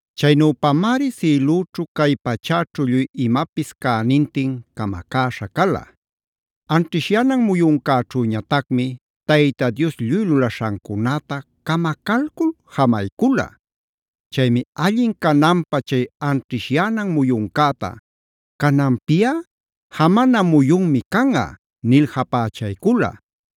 Chaynüpamari sïlüćhu cay pachäćhu lluy imapis cänintin camacäśha cala. Anćhishyänan muyuncäćhüñatacmi Tayta Dios lluy lulaśhancunäta camacalcul jamaycula.a Chaymi allin cananpä chay anćhishyänan muyuncäta “Cananpiꞌa jamana muyunmi canꞌa” nil japächaycula.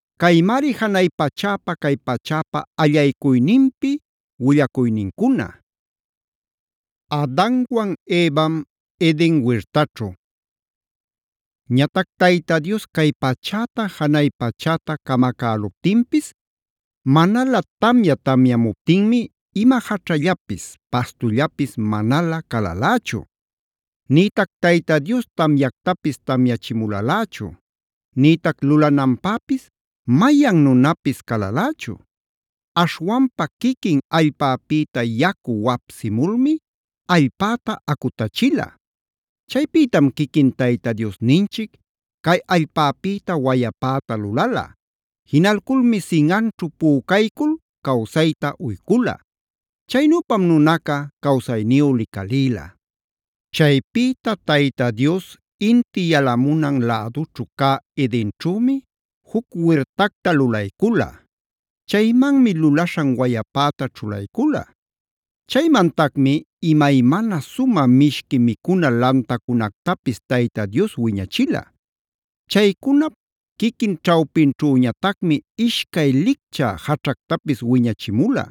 Caymari janay pachäpa cay pachäpa allaycuyninpi willacuynincuna. Adanwan Evam Eden wirtaćhu Ñatac Tayta Dios cay pachäta janay pachäta camacäluptinpis, manalä tamya tamyamuptinmi ima jaćhallapis, pastullapis manalä calalächu. Nïtac Tayta Dios tamyactapis tamyachimulalächu, nïtac lulananpäpis mayan nunapis calalächu. Aśhwanpa quiquin allpäpïta yacu wapsimulmi allpäta acutachila. Chaypïtam quiquin Tayta Diosninchic cay allpäpïta wayapäta lulala. Jinalculmi sinꞌanćhu pücaycul cawsayta uycula. Chaynüpam nunaca cawsayniyu licalïla. Chaypïta Tayta Dios inti yalamunan lädućhu cä Edenćhümi juc wirtacta lulaycula. Chaymanmi lulaśhan wayapäta ćhulaycula. Chaymantacmi imaymana sumä mishqui micuna lantacunactapis Tayta Dios wiñachila. Chaycunap quiquin ćhawpinćhüñatacmi ishcay lichcä jaćhactapis wiñachimula.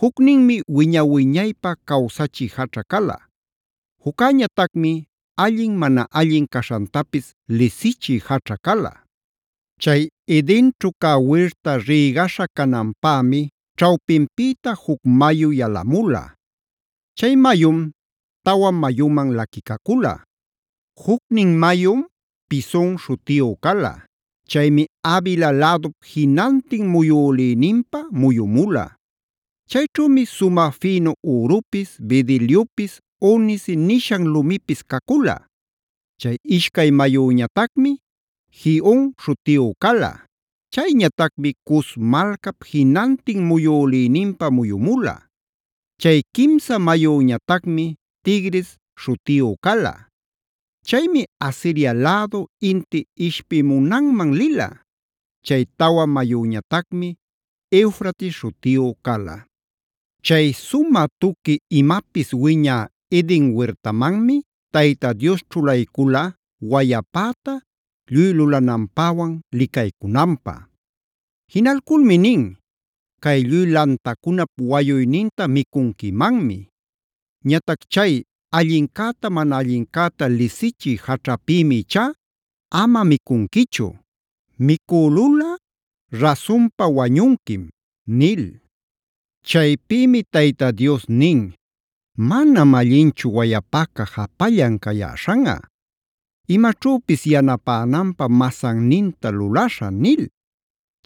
Jucninmi “wiña-wiñaypä cawsachï jaćha”c cala. Juccäñatacmi “allin mana allin caśhantapis lisichï jaćha” cala. Chay Edenćhu cä wirta rïgaśha cananpämi ćhawpinpïta juc mayu yalamula. Chay mayum tawa mayuman laquicacula. Jucnin mayum “Pison” śhutiyu cala. Chaymi Havila lädup jinantin muyülïninpa muyumula. Chayćhümi sumä fïnu ürupis, bedeliopis, onice nishan lumipis cacula. Chay ishcay mayüñatacmi “Gihon” śhutiyu cala. Chayñatacmi Cus malcap jinantin muyülïninpa muyumula. Chay quimsa mayüñatacmi “Tigris” śhutiyu cala. Chaymi Asiria lädu, inti ishpimunanman lila. Chay tawa mayüñatacmi “Eufrates” śhutiyu cala. Chay sumä tuqui imapis wiñä Eden wirtamanmi Tayta Dios ćhulaycula wayapäta lluy lulananpäwan licaycunanpä. Jinalculmi nin: “Cay lluy lantacunap wayuyninta micunquimanmi. Ñatac chay ‘allincäta mana allincäta’ lisichï jaćhapïmi ichá ama micunquichu. Micülulꞌa, rasunpa wañunquim”d nil. Chaypïmi Tayta Dios nin: “Manam allinchu wayapaca japallan cayäśhanꞌa. Imaćhüpis yanapänanpä masanninta lulaśhä” nil.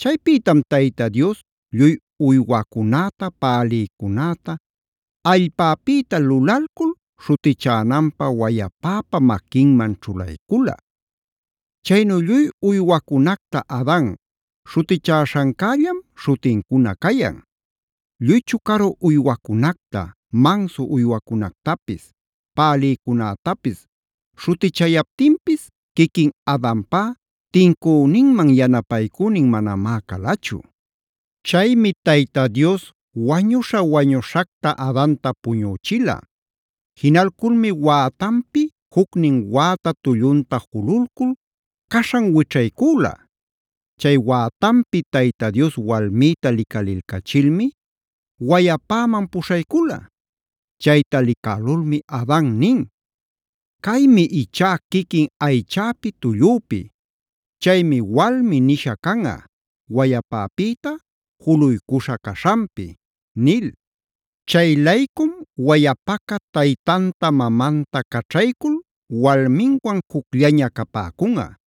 Chaypïtam Tayta Dios lluy uywacunäta, pälïcunäta allpäpïta lulalcul, śhutichänanpä wayapäpa maquinman ćhulaycula. Chaynu lluy uywacunacta Adan śhutichäśhancällam śhutincuna cayan. Lluy chucaru uywacunacta, mansu uywacunactapis, pälïcunätapis śhutichayaptinpis quiquin Adanpá tincüninman yanapaycünin manamá calachu. Chaymi Tayta Dios wañuśha-wañuśhacta Adanta puñüchila. Jinalculmi wätanpi jucnin wäta tullunta jululcul caśhan wićhaycüla. Chay wätanpi Tayta Dios walmïta licalilcachilmi wayapäman puśhaycula. Chayta licälulmi Adan nin: “Caymi ichá quiquin aychäpi tullüpi. Chaymi ‘walmi’ nisha canꞌa, wayapäpïta juluycuśha caśhanpi” nil. Chay-laycun wayapaca taytanta mamanta caćhaycul walminwan jucllaña capäcunꞌa.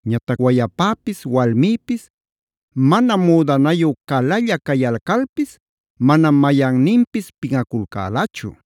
Ñatac wayapäpis walmïpis mana müdanayu calalla cayalcalpis manam mayanninpis pinꞌaculcälachu.